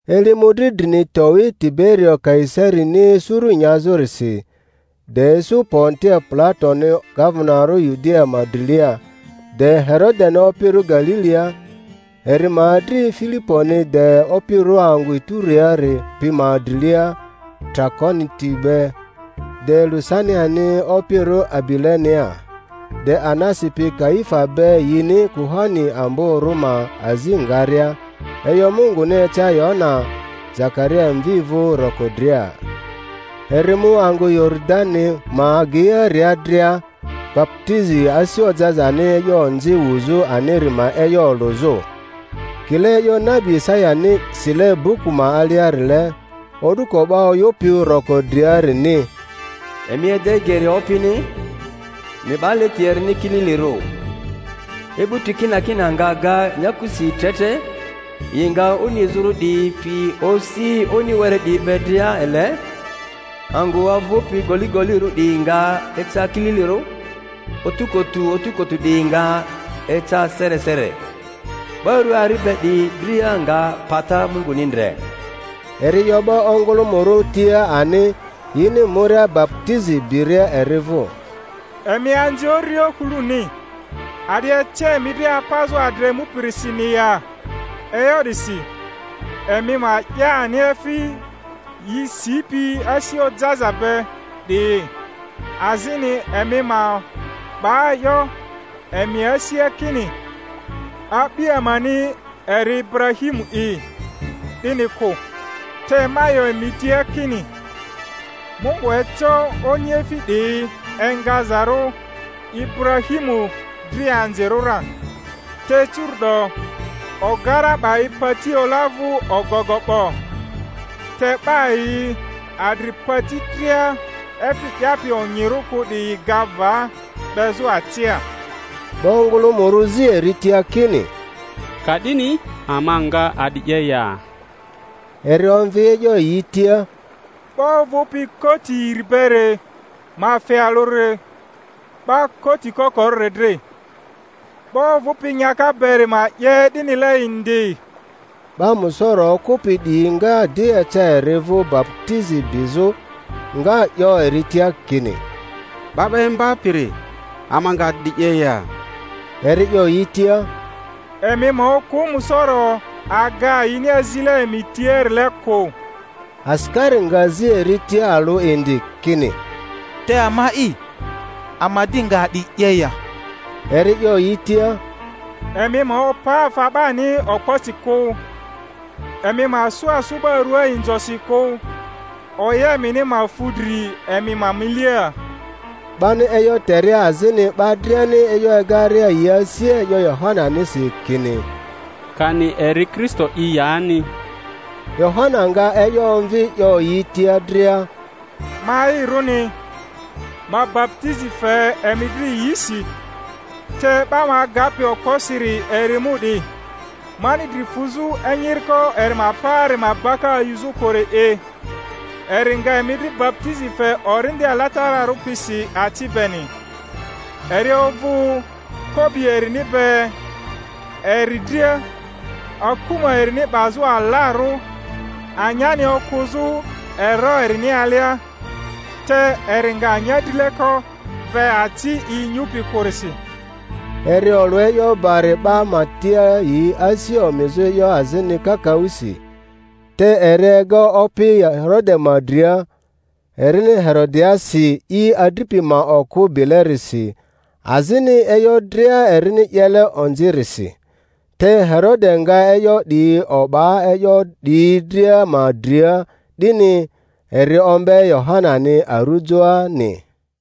Eli mᴜdri drini towi Tiberio Kaisarini suru nyazᴜrisi, de isu Pontio Pilatoni gavenarᴜ Yudia ma drilia, de Herodeni opirᴜ Galilia, eri ma adri Filiponi de opirᴜ angᴜ Ituriari pi ma drilia Trakoniti be, de Lusaniani opirᴜ Abilenea, de Anasi pi Kaifa be yini kuhani amborᴜ ma azi ngaria, e'yo Munguni eca Yohana Zakaria mvi vᴜ roko dria; eri mu angᴜ Yoridani ma ageiaria dria, baputizi asi ojazani e'yo onzi wuzᴜ aniri ma e'yo olᴜzᴜ. Kile e'yo nabi Isayani sile buku ma aliarile, O'duko 'ba oyᴜpi roko driarini: Emi ede geri Opini, emi 'ba leti erini kililirᴜ. E'buti kinakina nga ga nyakusi tre tre, yi nga oni izᴜrᴜ 'diyi pi osi oni were 'diyi be dria ele, angᴜ ovᴜpi goligolirᴜ 'diyi nga eca kililirᴜ, otukutu otukutu 'diyi nga eca seresere; 'ba rᴜa ari be 'diyi dria nga pata Munguni ndre. Eri 'yo 'ba ongᴜlᴜmᴜrᴜ tia ani, yini muria baputizi biria eri vᴜ, Emi anzi uriohuluni! A'di ece emi dri apazᴜ adra emupirisini ya? E'yo 'disi emi ma 'ya ani efi yi sipi asi ojaza be 'diyi, azini emi ma 'ba 'yo emi asia kini, A'bi amani eri Iburahimu'i, 'dini kᴜ; te ma 'yo emi tia kini, Mungu eco oniefi 'diyi engazarᴜ Iburahimu dri anzirᴜ ra. Te curu’do ogara 'ba i pati ola vᴜ ogogo 'bo; te 'ba yi adri pati dria efi 'yapi onyirᴜ kᴜ 'diyi ga va, 'bezᴜ acia. 'Ba ongᴜlᴜmᴜrᴜ zi eri tia kini, Ka'dini ama nga a'di 'ye ya? Eri omvi e'yo yi tia, 'Ba ovᴜpi koti iri beri ma fe alᴜri 'ba koti kokorᴜri dri; 'ba ovᴜpi nyaka beri ma 'ye 'dinile indi. 'Ba musoro okᴜpi 'diyi nga di eca eri vᴜ baputizi bizᴜ, nga 'yo eri tia kini, 'Ba 'ba Imbapiri, ama nga a'di 'ye ya? Eri 'yo yi tia, Emi ma okᴜ musoro aga yini azile emi tiarile kᴜ. Asikari nga zi eri tia alᴜ indi, kini, Te ama'i, ama di nga a'di 'ye ya? Eri 'yo yi tia, Emi ma opa afa 'bani okposi kᴜ, emi ma sᴜ asᴜ 'ba ruaa inzosi kᴜ, oya emini ma fu dri emi ma milia. 'Bani e'yo teria azini 'ba driani e'yo egaria yi asia e'yo Yohananisi kini, kani eri Kristo'i yani, Yohana nga e'yo omvi 'yo yi tia dria, Ma'irᴜni, ma baputizi fe emi dri yisi; te 'ba ma agapi okposiri eri emu 'di, mani dri fuzᴜ enyiriko eri ma paari ma baka ayuzᴜ kᴜri'i; eri nga emi dri baputizi fe Orindi Alatararᴜ pisi aci beni. Eri ovᴜ kobi erini be eri dria, akuma erini 'bazᴜ alarᴜ, anyani okᴜzᴜ ero erini alia; te eri nga anya drileko ve aci i inyupi kᴜrisi. Eri olᴜ e'yo bari 'ba ma tia, yi asi omizᴜ e'yo azini kakaᴜsi. Te eri ega opi Herode ma dria, erini Herodiasi i adripi ma okᴜ bilerisi, azini e'yo dria erini 'yele onzirisi; te Herode nga e'yo 'di o'ba e'yo 'diyi dria ma dria 'dini, eri ombe Yohanani arujoani.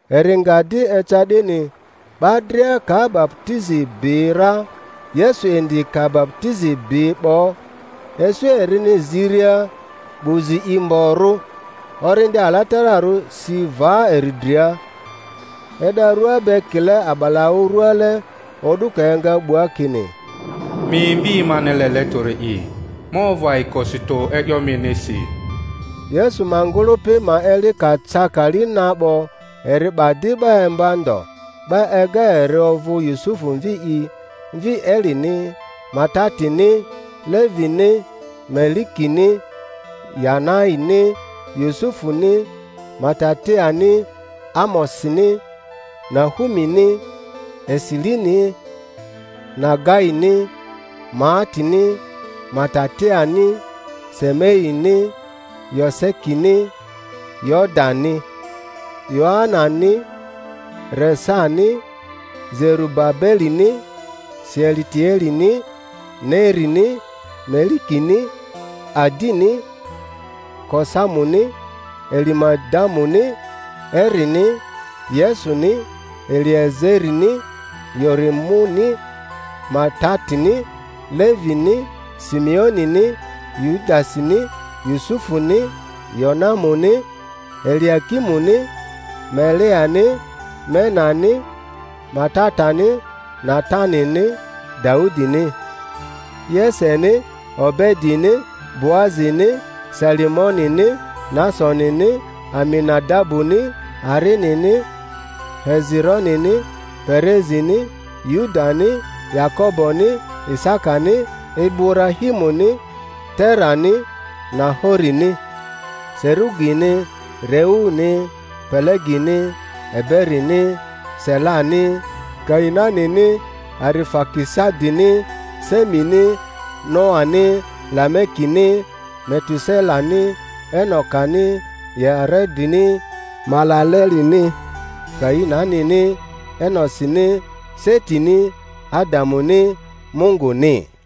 Eri nga di eca 'dini, 'ba dria ka baputizi bi ra, Yesu indi ka baputizi bi 'bo, isu erini ziria, 'bu zi i mgborᴜ, Orindi Alatararᴜ si va eri dria, e'da rua be kile a'balaᴜ ruale, o'duko enga 'bua kini, Mi Mvi mani lele tᴜri'i; ma ovᴜ ayikosi tᴜ e'yo minisi. Yesu ma ngᴜlᴜpi ma eli ka ca kali na 'bo, eri 'ba di 'ba imba ndo; 'ba ega eri ovᴜ Yusufu mvi'i, mvi Elini, Matatini, Levini, Melikini, Yanaini, Yusufuni, Matatiani, Amosini, Nahumini, Esilini, Nagaini, Maatini, Matatiani, Semeini, Yosekini, Yodani, Yoanani, Resani, Zerubabelini, Sealitielini, Nerini, Melikini, Adini, Kosamuni, Elimadamuni, Erini, Yesuni, Eliezerini, Yorimuni, Matatini, Levini, Simeonini, Yudasini, Yusufuni, Yonamuni, Eliakimuni, Meleani, Menani, Matatani, Natanini, Daudini, Yeseni, Obedini, Boazini, Salimonini, Nasonini, Aminadabuni, Arinini, Hezironini, Perezini, Yudani, Yakoboni, Isakani, Iburahimuni, Terani, Nahorini, Serugini, Reuni, Pelegini, Eberini, Selani, Kainanini, Arifakisadini, Semini, Noani, Lamekini, Metuselani, Enokani, Yaredini, Malalelini, Kainanini, Enosini, Setini, Adamuni, Munguni.